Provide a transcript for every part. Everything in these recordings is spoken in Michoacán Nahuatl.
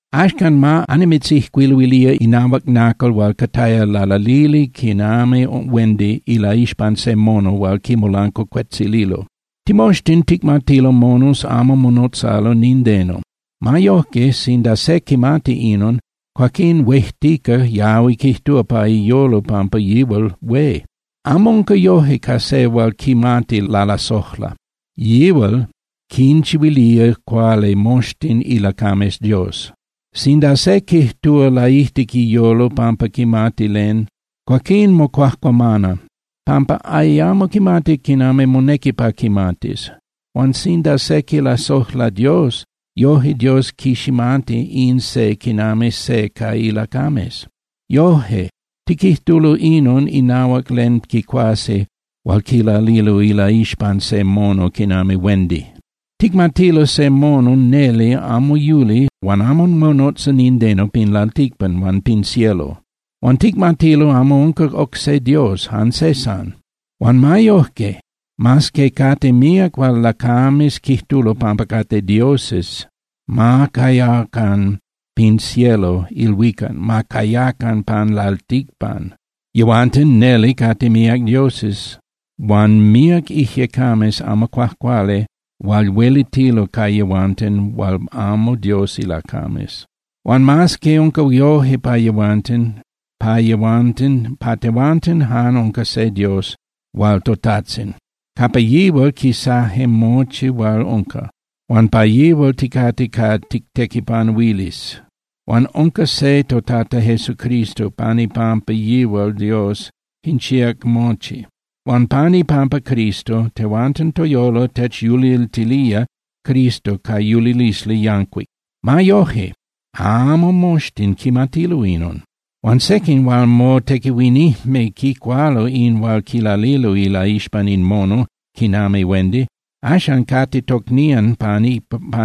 Axcan ma annimitzijcuiluilía inahuac nacal hual cataya lalalili quinami huendi ilaixpan se mono hual quimolancuacuetzililo. Timoxtin ticmatilo monos amo monotzalo nindeno. Ma yojque, sinda se quimati inon, cuaquín huejtica yahui quijtúa pa iyolo pampa yihual hué. Amo unca yoje ca se hual quimati lalasojla, yihual quinchihuilía cuali moxtin ilacames Dios. Sinda se quijtúa laijtic iyolo pampa quimati len, cuaquín mocuajcuamana, pampa ayamo quimati quinami monequi pa quimatis. Huan sinda se quilasojla Dios, yoje Dios quiximati in se quinami se ca ilacames. Yoje, tiquijtulo inon inahuac len quicuasi hual quilalilo ilaixpan se mono quinami huendi. Ticmatilo se mono neli amo yuli huan amo monotza nindeno pin lalticpan huan pin cielo. Huan ticmatilo amo unca oc se Dios, jan se san. Huan ma yojque, mas que cate míac hual lacames quijtulo pampa cate dioses, ma cayacan pin cielo (ilhuicac), ma cayacan pan lalticpan, yehuanten neli cate míac dioses huan míac ijyecames amo cuajcuali hual huelitilo ca yehuanten hual amo Dios ilacames. Huan mas que unca yoje pa yehuanten, pa tehuanten jan unca se Dios hual toTajtzin. Capa yihual quisaje mochi hual unca, huan pa yihual ticate pa tictequipanuilis. Huan unca se toTata Jesucristo, pan ipampa yihual Dios quinchíac mochi. Huan pan ipampa Cristo, tehuanten toyolo techyuliltilía Cristo ca yulilisli yancuic. Ma yojque, amo moxtin quimatilo inon. Huan sequin hual motequihuinijme quicualo in hual quilalilo ilaixpan in mono quinami huendi, axan cate tocnían pan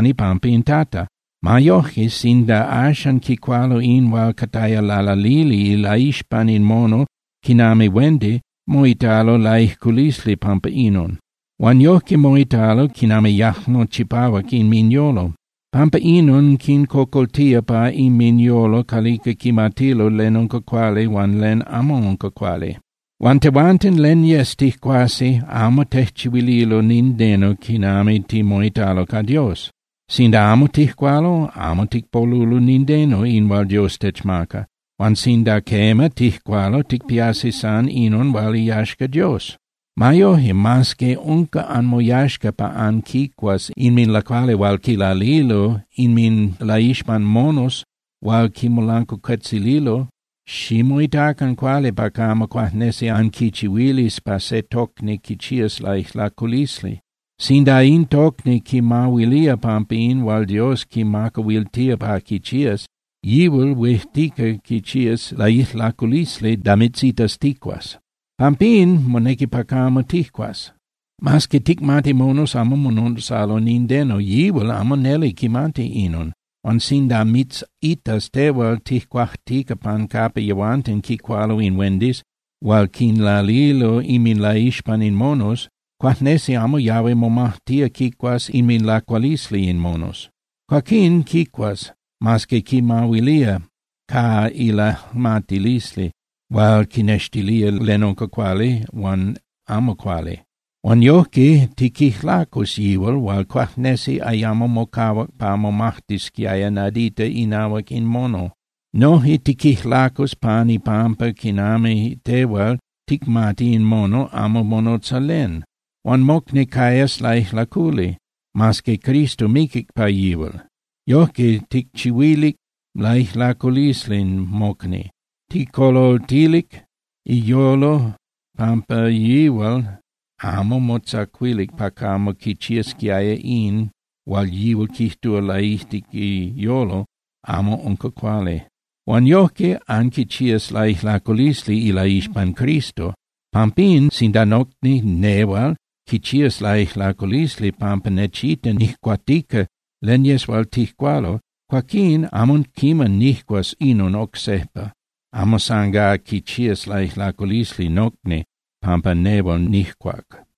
ipampa in Tata. Ma yojque sinda axan quicualo in hual cataya lalalili ilaixpan in mono quinami huendi, moitalo laijlaculi pampa inon. Huan yojque moitalo quinami yajmo chipahuac inminyolo. Pampa inon, quincocoltía pa inminyolo calica quimatilo len unca cuali huan len amo unca cuali. Huan tehuanten, len yes tijcuasi amo tejchihuililo nindeno quinami timoitalo ca Dios. Sinda amo tijcualo, amo ticpolulo nindeno in hual Dios techmaca, huan sinda quema, tijcualo, ticpiasi san inon hual iyaxca Dios. Ma yoje, mas que unca anmoyaxca pa anquicuas inminlacuali hual quilalilo inminlaixpan monos hual quinmolancuacuetzililo, ximoitacan cuali pa camo cuajnesi anquichihuilis pa se tocni quichiás laijlaculisli. Sinda in tocni quimahuilía pampa in hual Dios quimacahuiltía pa quichías, yihual huejtica quichiás laijlaculisli da mitzitas tijcuas. Pampín, monequi pa camo tijcuas. Mas que ticmati monos amo monotzalo nindeno, yihual amo neli quimati inon. Huan sinda mitzitas tehual tijcuajtica pan capa yehuanten quicualo in huendis hual quinlalilo inminlaixpan in monos, cuajnesi amo yahui momajtía quicuas inminlacualisli in monos. Cuaquín quicuas, mas que quimahuilía ca ilajmatilisli hual quinextilía len unca cuali huan amo cuali. Huan yojque, tiquijlacus yihual hual cuajnesi ayamo mocahuac pa momajtisquiaya nadita inahuac in mono. Noje tiquijlacus pan ipampa quinami tehual ticmati in mono amo monotza len. Huan mocni cayas laijlaculi, mas que Cristo miquic pa yihual. Yojque, ticchihuilic laijlaculisli mocni, tijcocoltilic iyolo pampa yihual amo motzacuilic pa camo quichiasquiaya in hual yihual quijtúa laijtic iyolo amo unca cuali. Huan yojque anquichías laijlaculisli ilaixpan Cristo. Pampín, sinda nocni nehual quichías laijlaculisli pampa nechita nijcuatica len yes hual tijcualo, cuaquín amo quiman nijcuas inon oc sejpa, amo san gá quichías laijlaculisli nocni pampa nehual nijcuac.